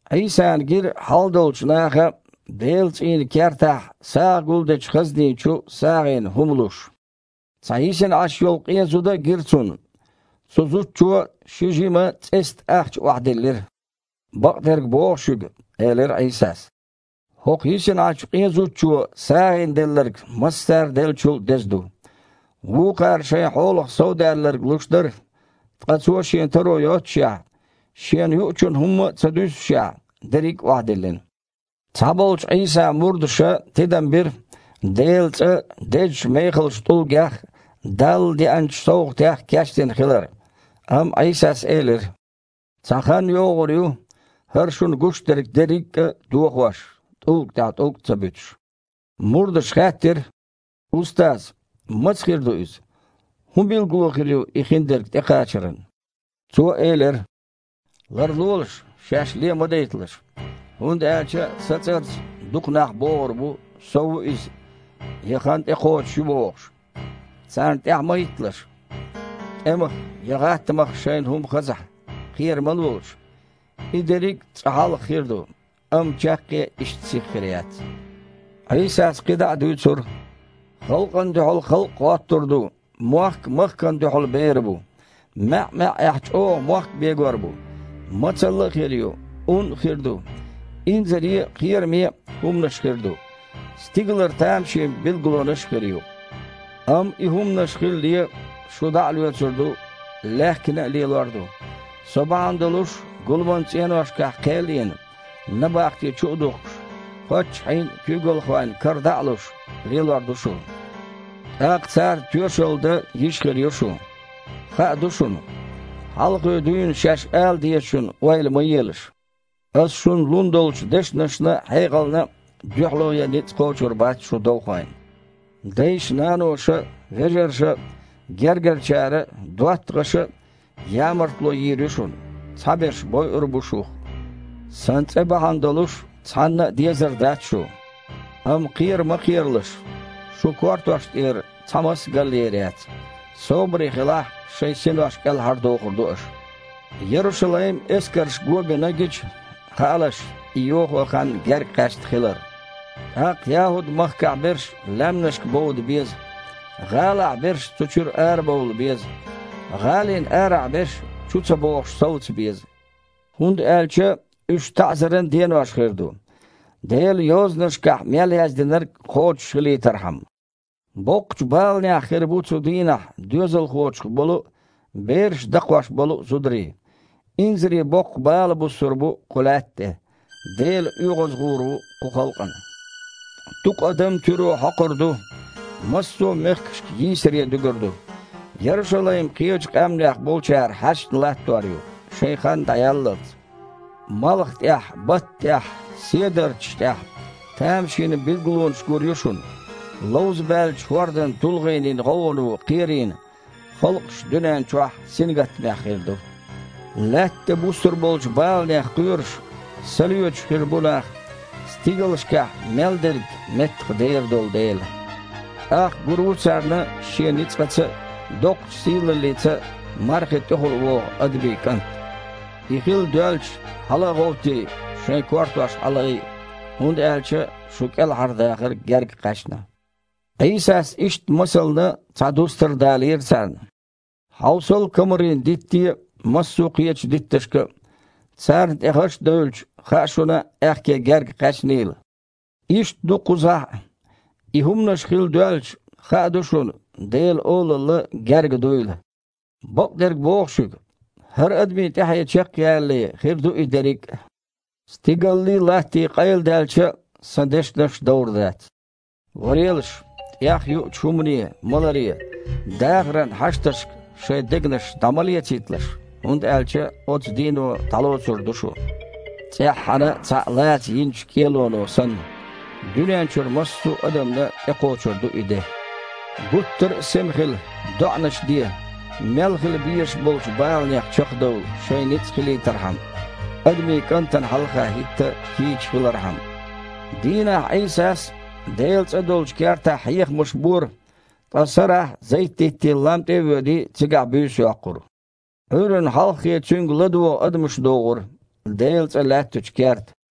Іийсана гира хьалдолчу наха Делан цІийнан кертахь сагІа гулдечу хазнина чу сагІина хІума луш. Цхьа йисина Іаш йолу къен зуда а гира Цунна. Цу зудчо ши жима цІестан ахча охьадиллира. «Бакъдерг боху шуьга, – элира Іийсас, – хІокху йисина Іачу къен зудчо сагІина делларг массара деллачул а деза ду. Вукхара шайн хьолах совдаьлларг луш дара, ткъа цо шен таро йоццушехь, шена юучунна хІумма а ца дуьссушехь, дерриг а охьадиллина». Цхьаболчу Іийсан мурдаша тидам бира Делан цІа дезачу мехалчу тІулгех а, Далла деанчу совгІатех а кечдина хилар. Амма Іийсас элира: «Цхьа хан йогІур ю, хІара шуна гуш дерг дерриг а дохош, тІулга тІехь тІулг а ца буьтуш». Мурдаша хаьттира: «Устаз! Маца хир ду иза? ХІун билгало хир ю и хиндерг тІекхачаран?» Цо элира: «Ларлолаш, шаьш ле ма дайталаш, хІунда аьлча Сан цІарца дукха нах богІур бу: „Со ву Иза“ я „Хан тІекхочуш ю“, – бохуш. Царна тІаьхьа ма хІитталаш. ТІемах я гІаттамах шайна хІума хазахь, кхера ма лолаш. И дерриг цкъа хьалха хир ду, амма чаккхе иштта сиха хир яц». Іийсас кхидІа а дуьйцура: «Халкъана дуьхьал халкъ гІоттур ду, мохк махкана дуьхьал бер бу. МаьІ-маьІІехь чІогІа мохк бегор бу, мацалла а хир ю, ун а хир ду, инзаре а, кхераме а хІуманаш хир ду, стигалара тамашийна билгалонаш а хир ю. Амма и хІуманаш хилале, шу дІа а лоьцур ду, лаьхкина а лелор ду. Со бахьана долуш, гуламан цІеношкахь кхел а йина, набахте чу а духкуш, паччахьийн а, куьйгалхойн а кара дІа а луш, лелор ду шу. ТІаккха царна тоьшалла дан йиш хир ю шун. Хаа ду шуна, хьалхе дуьйна шаьш ала дезачун ойла ма елаш. Ас шуна лун долчу дешнашна а, хьекъална а дуьхьало ян ницкъ кхочур бац шун довхойн. Дайша-наноша а, вежарша а, гергарчара а, доттагІаша а ямартло йийр ю шуна, цхьаберш бойур а бу шух. Сан цІе бахьана долуш цхьанна а дезар дац шу. Амма кхера ма кхералаш, шун кортош тІера цхьа мас а галъер яц. Собаре хилахь, шайн синош кІелхьардохур ду аша». «Ярушалайм эскарша го бина гича, хаалаш, и йохо хан гергакхаьчна хилар. ТІаккха ЯхІуд-махкахь берш лаьмнашка бовда беза, гІалахь берш цу чуьра арабовла беза, гІалина арахь берш чу ца богІуш совца беза, хІунда аьлча уьш „таІзаран денош“ хир ду, Делан Йозанашкахь мел яздинарг кхочушхилийтархьама. Боккхачу баланехь хир бу цу дийнахь доьзалхочух болу а, бераш дакхош болу а зударий. Инзаре боккха бала буссур бу кху лаьтта тІе, Дела оьгІазгІур ву кху халкъана. Дукха адам туьро хьокхур ду, массо а мехкашка йийсаре дуьгур ду. Ярушалайм кхечу къаьмнех болчара хьаьшна латтор ю, шайн хан дІаяллалц». «Малха тІехь, батта тІехь, седарчаш тІехь тамашийна билгалонаш гур ю шуна. Ловзабаьллачу хІордан тулгІенийн гІовгІано кхерийна халкъаш дуьнен чохь сингаттамехь хир ду. Лаьтта тІе буссур болчу баланех кхоьруш, са лоьцуш хир бу нах, стигалшкахь мел дерг меттахдер йолу дела. ТІаккха гур ву царна Шен ницкъаца а, доккхачу сийлаллица а „мархи тІехула вогІу Адамийн КІант“. И хила доьлча, хьала а гІовттий, шайн кортош хьалаайа, хІунда аьлча шун кІелхьардахар герга кхаьчна». Іийсас иштта масална цхьа дустар далийра царна: «Хьовсал комарийн дитте а, массо кхечу дитташка а. Царна тІе гІаш девлча, хаьа шуна аьхке герга кхаьчнийла. Иштта ду кхузахь а, и хІуманаш хила доьлча, хаа ду шуна Делан Олалла гергга дуйла. Бакъдерг боху шуьга: хІара адамийн тІаьхье чекхъялале хир ду и дерриг а. Стигаллий, латтий къайладаьлча а, Сан дешнаш довр дац». «Варелаш, тІехъюучу хІумане, маларе, дахаран хьашташка шайн дегнаш дІа ма лецийталаш, хІунда аьлча оцу дийно дІалоцур ду шу, цІеххьана цхьаъ лаца йинчу кІелоно санна. Дуьнен чуьра массо а адамна тІекхочур ду и де. Гуттар а сема хила, доІанаш де, мел хила безаш болчу баланех чекхдовла шайн ницкъ хилийтархьама, Адамийн КІантана хьалха хІитта кийча хилархьама». Дийнахь Іийсас Делан цІа долчу кертахь хьехамаш бора, ткъа сарахь Зайт-диттийн лам тІе а воьдий, цигахь буьйса йоккхура. Іуьйранна хьалххе Цуьнга ладогІа адамаш догІура Делан цІа лаьттачу керта.